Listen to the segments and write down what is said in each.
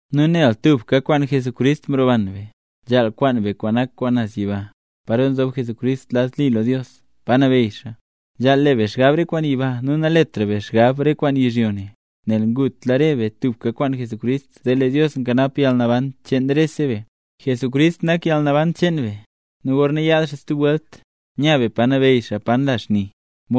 Nu nel tubka mroban be kwaan Jesucrist, nzhaal kwaan be kwaan nak kwaan naz yiba, paro nzob Jesucrist lad li lo Dios, pa nabeyy xaa. Nu nzhaal le be xgab re kwaan yiba nu naletra be xgab re kwaan yizhyo ne, nel ngutla re be tubka kwaan Jesucrist zee Dios nkanap yalnaban cheen rese be. ¡Jesucrist nak yalnaban cheen be! Nu gorna yaad xaa stub welt, nya be pa nabeyy xaa pa nla xni.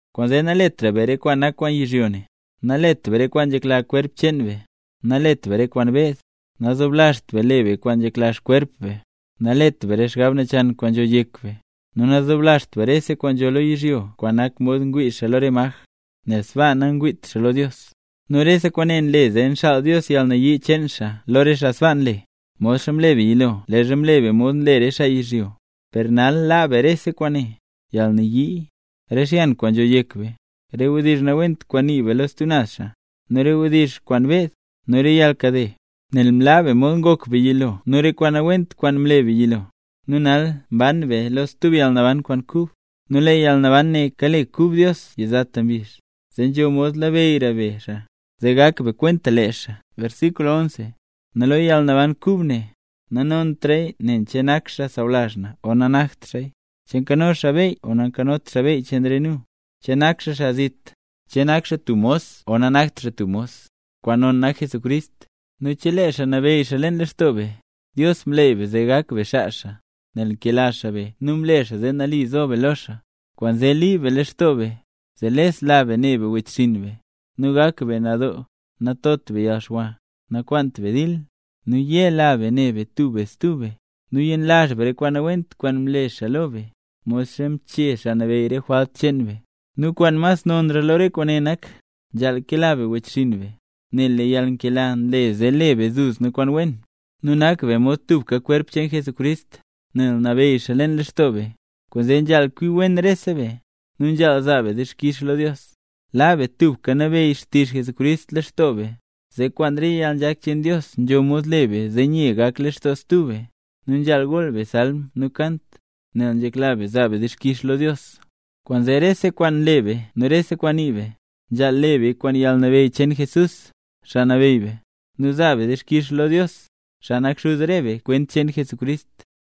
Kwaanzee naletra be re kwaan nak kwaan yizhyo ne: Nalet be re kwaan nzhekla kwerp cheen be, nalet be re kwaan beed, nazoblazht be le be re kwaan nzhekla kwerp cheen be, nalet be re xgab nachan kwaan nzho yek be, nu nazoblazht be rese kwaan nzho lo yizhyo kwaan nak mod ngwii xaa lo re maj, nel sbaa nangwiit xaa lo Dios. Nu rese kwaane nle zee nxaal Dios yalnayii cheen xaa lo re xaa sbaa nle, modxa mle be yilo leezha mle be mod nle re xaa yizhyo. Per nal laa be rese kwaane: yalnayii, re xyan kwaan nzho yek be, re wdizh nawent kwaan nii be lo stub naz xaa, nu re wdizh kwaan beed, nu re yalnkade. Nel mlaa be mod ngok be yilo nu re kwaan nawent kwaan mle be yilo; nu nal mban be lo stub yalnaban kwaan kub, nu lee yalnaban ne kale kub Dios yizata mbizh, zee nzho mod labeyyra be xaa, zee gak be kwenta lee xaa. Nu lo yalnaban kub ne, nanontra nen che nak xaa sawlazh na o nanakt xaa, che nzho xaa beyy o nanzhot xaa beyy cheen re nu, che nak xaa xaa zit, che nak xaa tub mos o nanakt xaa tub mos, kwaan non nak Jesucrist, nu chelee xaa nabeyy xaa leen lextoo be. Dios mleey be zee gak be xaa xaa, nel nkela xaa be nu mle xaa nambey be lo xaa. Kwaanzee liib be lextoo be: zee lesla be ne be wechxinn be, nu gak be nadoo, natot be yalxwa, nakwaant be dil, nu yela be ne be tub be stub be, nu yenlazh be re kwaan nawent kwaan mle xaa lo be, modxa mchee Xaa Nabeyy re jwalt cheen be. Nu kwaan mas nonra lo re kwaane nak: Nzhaal kela be wechxinn be, nel lee yalnkela nle zee le be duzna kwaan wen. Nu nak be mod tubka kwerp cheen Jesucrist, nel nabeyy xaa leen lextoo be, kwaanzee nzhaal kwi wen rese be, nu nzhaal zaa be dixkix lo Dios. Laa be tubka nabeyy xtizh Jesucrist leen lextoo be, zee kwaan re yalnzhak cheen Dios nzho mod le be zee nye gak lextoo stub be. Nu nzhaal gool be salm nu kant, nel nzhekla be zaa be dixkix lo Dios. Kwaanzee rese kwaan nle be nu rese kwaan nii be, nzhaal le beya kwaan yalnabeyy cheen Jesús, Xaa Nabeyy be, nu zaa be dixkix lo Dios, xaa nak Xuz re be kwent cheen Jesucrist.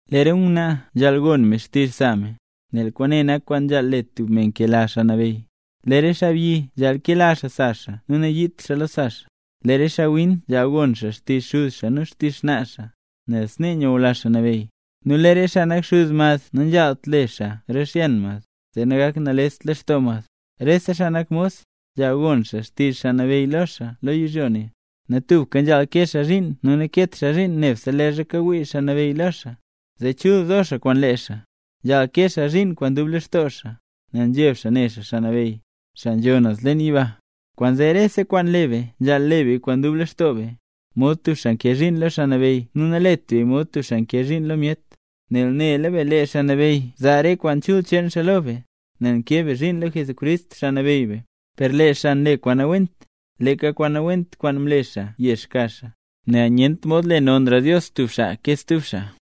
Lee re ngwnaa nzhaal gon me xtizh sa me, nel kwaane nak kwaan nzhaal le tub me nkela Xaa Nabeyy. Lee re xaabyi nzhaal kela xaa sa xaa nu nayiit xaa lo sa xaa. Lee re xaawin nzhaal gon xaa xtizh xuz xaa nu xtizh xnaa xaa, nel snee nyula Xaa Nabeyy. Nu lee re xaa nak xuz mad nanzhaalt le xaa rixyan mad, zee nagakt nalest lextoo mad. Rese xaa nak mos, nzhaal gon xaa xtizh xaa nabeyy lo xaa lo yizhyo ne. Nu tubka nzhaal kee xaa zhiin nu nakeet xaa zhiin nebse leezha kawii xaa nabeyy lo xaa, zee chul zo xaa kwaan lee xaa, nzhaal kee xaa zhiin kwaan dub lextoo xaa, nel nzheb xaa ne xaa Xaa Nabeyy, xaa nzho naz leen yiba. Kwaanzee rese kwaan le be nzhaal le beya kwaan dub lextoo be, mod tub xaa nkee zhiin lo Xaa Nabeyy nu nalet beya mod tub xaa nkee zhiin lo myet. Nel nela be, lee Xaa Nabeyy zaa re kwaan chul cheen xaa lo be, nel nkee be zhiin lo Jesucrist, Xaa Nabeyy be. Per lee xaa kwaan nle kwaan nawent, leeka kwaan nawent kwaan mle xaa yex ka xaa, nel nyent mod le Dios nonra tub xaa ke stub xaa.